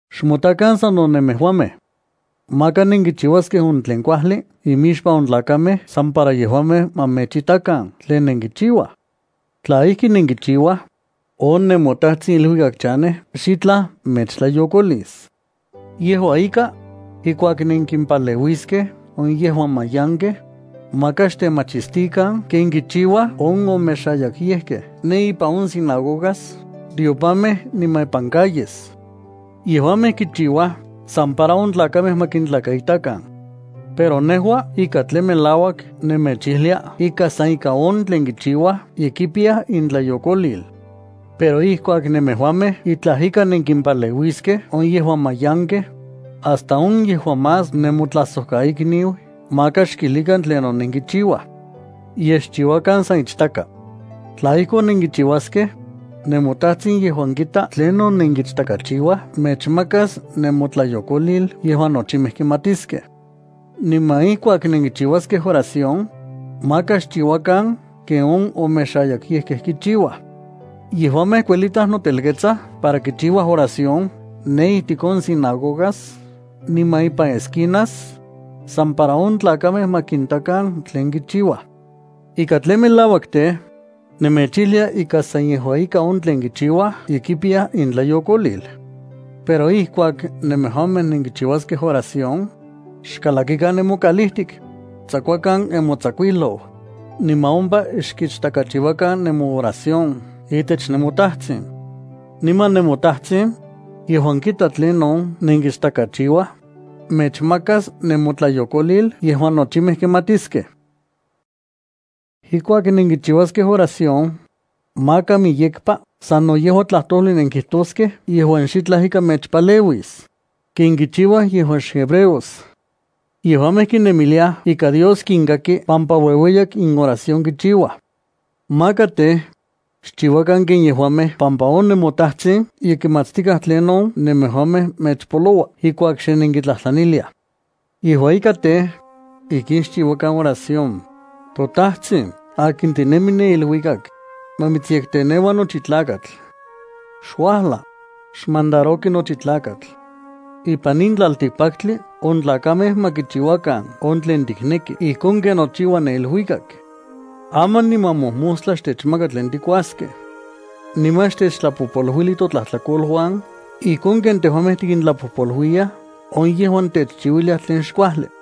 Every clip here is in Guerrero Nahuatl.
’Xmotakan sano nemejuamej. Maka nenkichiuaskej on tlen kuajli imixpan on tlakamej san para yejuamej ma mechitakan tlen nenkichiuaj. Tla ijki nenkichiuaj, on nemoTajtsin iluikak chanej xitlaj mechtlayokolis. ’Yejua ika, ijkuak nenkimpaleuiskej on yejuan mayankej, maka xtemachistikan ken kichiuaj on omexayakyejkej ne ipan on sinagogas, tiopamej niman ipan calles. Yejuamej kichiuaj san para on tlakamej ma kintlakaitakan. Pero nejua ika tlen melauak nemechijlia ika san ika on tlen kichiuaj ye kipiyaj intlayokolil. Pero ijkuak nemejuamej itlaj ika nenkimpaleuiskej on yejuan mayankej, hasta on yejuan más nemotlajsojkaikniu maka xkilijkan tlinon nenkichiuaj. Yej xchiuakan san ichtaka. Tla ijkon nenkichiuaskej, nemoTajtsin yejuan kita tlinon nenkichtakachiuaj mechmakas nemotlayokolil yejuan nochimej kimatiskej. ’Niman ijkuak nenkichiuaskej oración, maka xchiuakan ken on omexayakyejkej kichiuaj. Yejuamej kuelitaj notelketsaj para kichiuaj oración ne ijtik on sinagogas niman ipan esquinas, san para on tlakamej ma kintakan tlen kichiuaj. Ika tlen melauak tej, nemechijlia ika san yejua ika on tlen kichiuaj ye kipiyaj intlayokolil. Pero ijkuak nemejuamej nenkichiuaskej oración, xkalakikan nemokaliltik, xtsakuakan nemotsakuijlou, niman ompa xkichtakachiuakan nemooración itech nemoTajtsin. Niman nemoTajtsin, yejuan kita tlinon nenkichtakachiuaj, mechmakas nemotlayokolil yejuan nochimej kimatiskej. ’Ijkuak nenkichiuaskej oración, maka miyekpa sano yejua tlajtojli nenkijtoskej yejuan xitlaj ika mechpaleuis, ken kichiuaj yejuan xhebreos. Yejuamej kinemiliaj ika Dios kinkaki pampa ueueyak inoración kichiuaj. Maka tej, xchiuakan ken yejuamej pampa on nemoTajtsin ye kimatstikaj tlinon nemejuamej mechpoloua ijkuak xe nenkitlajtlaniliaj. Yejua ika tej, ijkin xchiuakan oración: ToTajtsin, akin tinemi ne iluikak, ma mitsyekteneua nochi tlakatl. Xuajla, xmandaroki nochi tlakatl. Ipan in tlaltikpaktli on tlakamej ma kichiuakan on tlen tikneki ijkon ken nochiua ne iluikak. Aman niman mojmostla xtechmaka tlen tikuaskej. Niman xtechtlapojpoluili totlajtlakoluan ijkon ken tejuamej tikintlapojpoluiyaj on yejuan techchiuiliaj tlen xkuajli.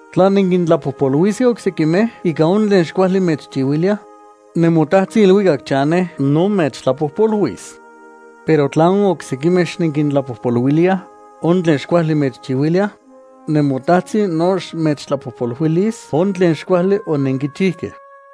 ’Tla nenkintlapojpoluiskej oksekimej ika on tlen xkuajli mechchiuiliaj, nemoTajtsin iluikak chanej no mechtlapojpoluis. Pero tla on oksekimej xnenkintlapojpoluiliaj on tlen xkuajli mechchiuiliaj, nemoTajtsin no xmechtlapojpoluilis on tlen xkuajli onenkichijkej.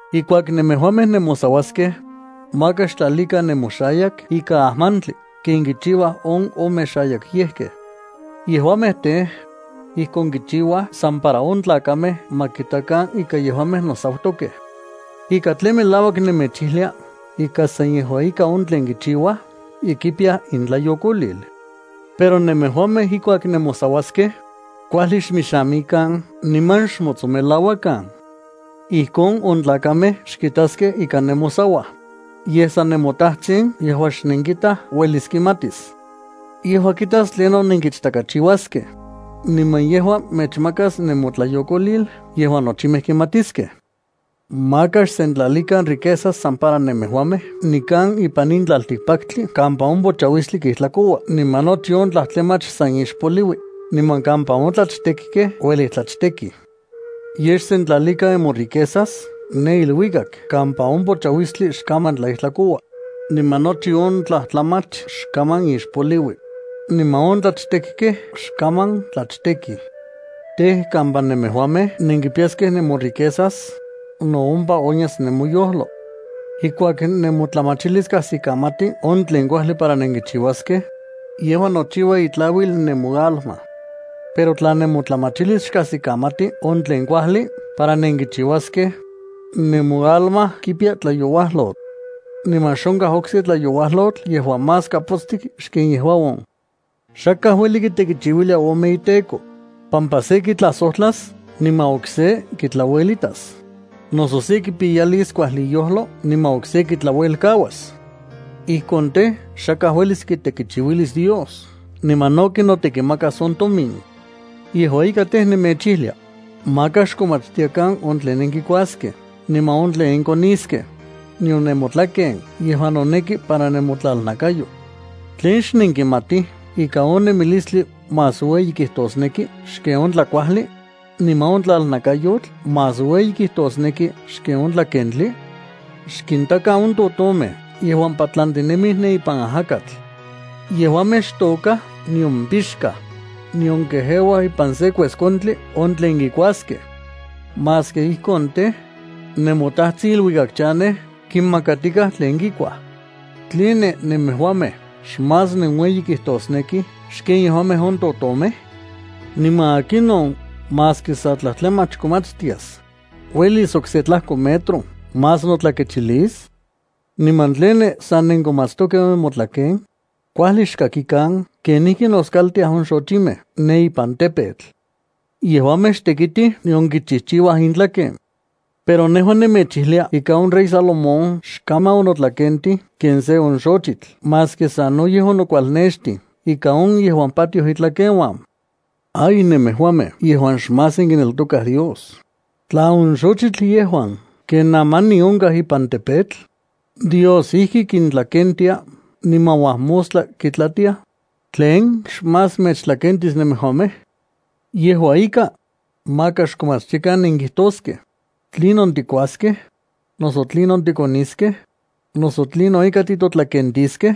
’Ijkuak nemejuamej nemosauaskej, maka xtlalikan nemoxayak ikan ajmantli ken kichiuaj on omexayakyejkej. Yejuamej tej, ijkon kichiuaj san para on tlakamej ma kitakan ika yejuamej nosautokej. Ika tlen melauak nemechijlia ika san yejua ika on tlen kichiuaj ye kipiyaj intlayokolil. Pero nemejuamej ijkuak nemosauaskej, kuajli xmixamikan niman xmotsonmelauakan. Ijkon on tlakamej xkitaskej ika nemosauaj, yej san nemoTajtsin yejuan xnenkitaj uelis kimatis. Yejua kitas tlinon nenkichtakachiuaskej, niman yejua mechmakas nemotlayokolil yejuan nochimej kimatiskej. ’Maka xsentlalikan riquezas san para nemejuamej nikan ipan in tlaltikpaktli kampa on pochauistli kijtlakoua niman nochi on tlajtlamach san ixpoliui, niman kampa on tlachtekkej uelij tlachtekij. Yej xsentlalikan nemoriquezas ne iluikak kampa on pochauistli xkaman tlaijtlakoua, niman nochi on tlajtlamach xkaman ixpoliui, niman on tlachtekkej xkaman tlachtekij. Tej, kampa nemejuamej nenkipiyaskej nemoriquezas, no ompa onyas nemoyojlo. ’Ijkuak nemotlamachilis kajsikamati on tlen kuajli para nenkichiuaskej, yejua nochiua itlauil nemoalma. Pero tla nemotlamachilis xkajsikamati on tlen kuajli para nenkichiuaskej, nemoalma kipiya tlayouajyotl. Niman xonkaj okse tlayouajyotl yejuan más kapotstik xken yejua on. ’Xakaj ueli kitekichiuilia ome iteko, pampa se kitlajsojtlas niman okse kitlauelitas, noso se kipiyalis kuajli iyojlo niman okse kitlaluelkauas. Ijkon tej, xakaj uelis kitekichiuilis Dios niman no kinotekimakas on tomin. ’Yejua ika tej, nemechijlia: Maka xkomatstiakan on tlen nenkikuaskej niman on tlen nenkoniskej, nion nemotlaken yejuan noneki para nemotlalnakayo. ¿Tlen xnenkimatij ika on nemilistli más ueyi kijtosneki xken on tlakuajli, niman on tlalnakayotl más ueyi kijtosneki xken on tlakentli? Xkintakan on totomej yejuan patlantinemij ne ipan ajakatl. Yejuamej xtôkaj nion pixkaj, nion kejeuaj ipan se kueskontli on tlen kikuaskej. Maski ijkon tej, nemoTajtsin iluikak chanej kinmakatikaj tlen kikuaj. ¿Tline nemejuamej xmás nenueyi kijtosnekij xken yejuamej on totomej? ¿Niman akinon maski sa tlajtlamach komatstias, uelis okse tlajko metro más notlakechilis? ’¿Niman tline sa nenkomatstokej on nemotlaken? Kuajli xkintakan kenijki noskaltiaj on xochimej ne ipan tepetl. Yejuamej xtekitij nion kichijchiuaj intlaken. Pero nejua nemechijlia ika on rey Salomón xkaman onotlakentij ken se on xochitl maski sanoyej onokualnextij ika on yejuan patioj itlakeuan. ¡Ay!, nemejuamej yejuan xmás nenkineltokaj Dios, tla on xojtli yejuan ken aman in onkaj ipan tepetl, Dios ijki kitlakentia niman uajmostla kitlatiaj, ¿tlen xmás mechtlakentis nemejuamej? Yejua ika, maka xkomatstiakan nenkijtoskej: “¿Tlinon tikuaskej?, noso ¿tlinon tikoniskej?, noso ¿tlinon ika titotlakentiskej?”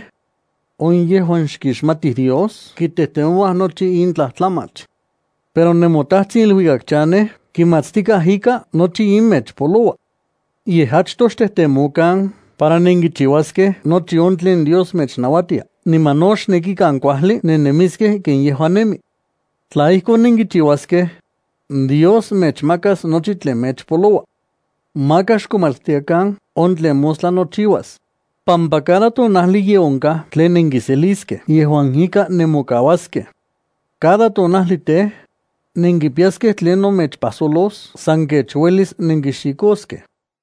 On yejuan xkixmatij Dios kitejtemouaj nochi in tlajtlamach. Pero nemoTajtsin iluikak chanej kimatstikaj ika nochi in mechpoloua. Yej achtoj xtejtemokan para nenkichiuaskej nochi on tlen Dios mechnauatia, niman no xnekikan kuajli nennemiskej ken yejua nemi. Tla ijkon nenkichiuaskej, Dios mechmakas nochi tlen mechpoloua. Maka xkomatstiakan on tlen mostla nochiuas, pampa cada tonajli ye onkaj tlen nenkiseliskej yejuan ika nemokauaskej. Cada tonajli tej, nenkipiyaskej tlinon mechpajsojlos san kech uelis nenkixikoskej.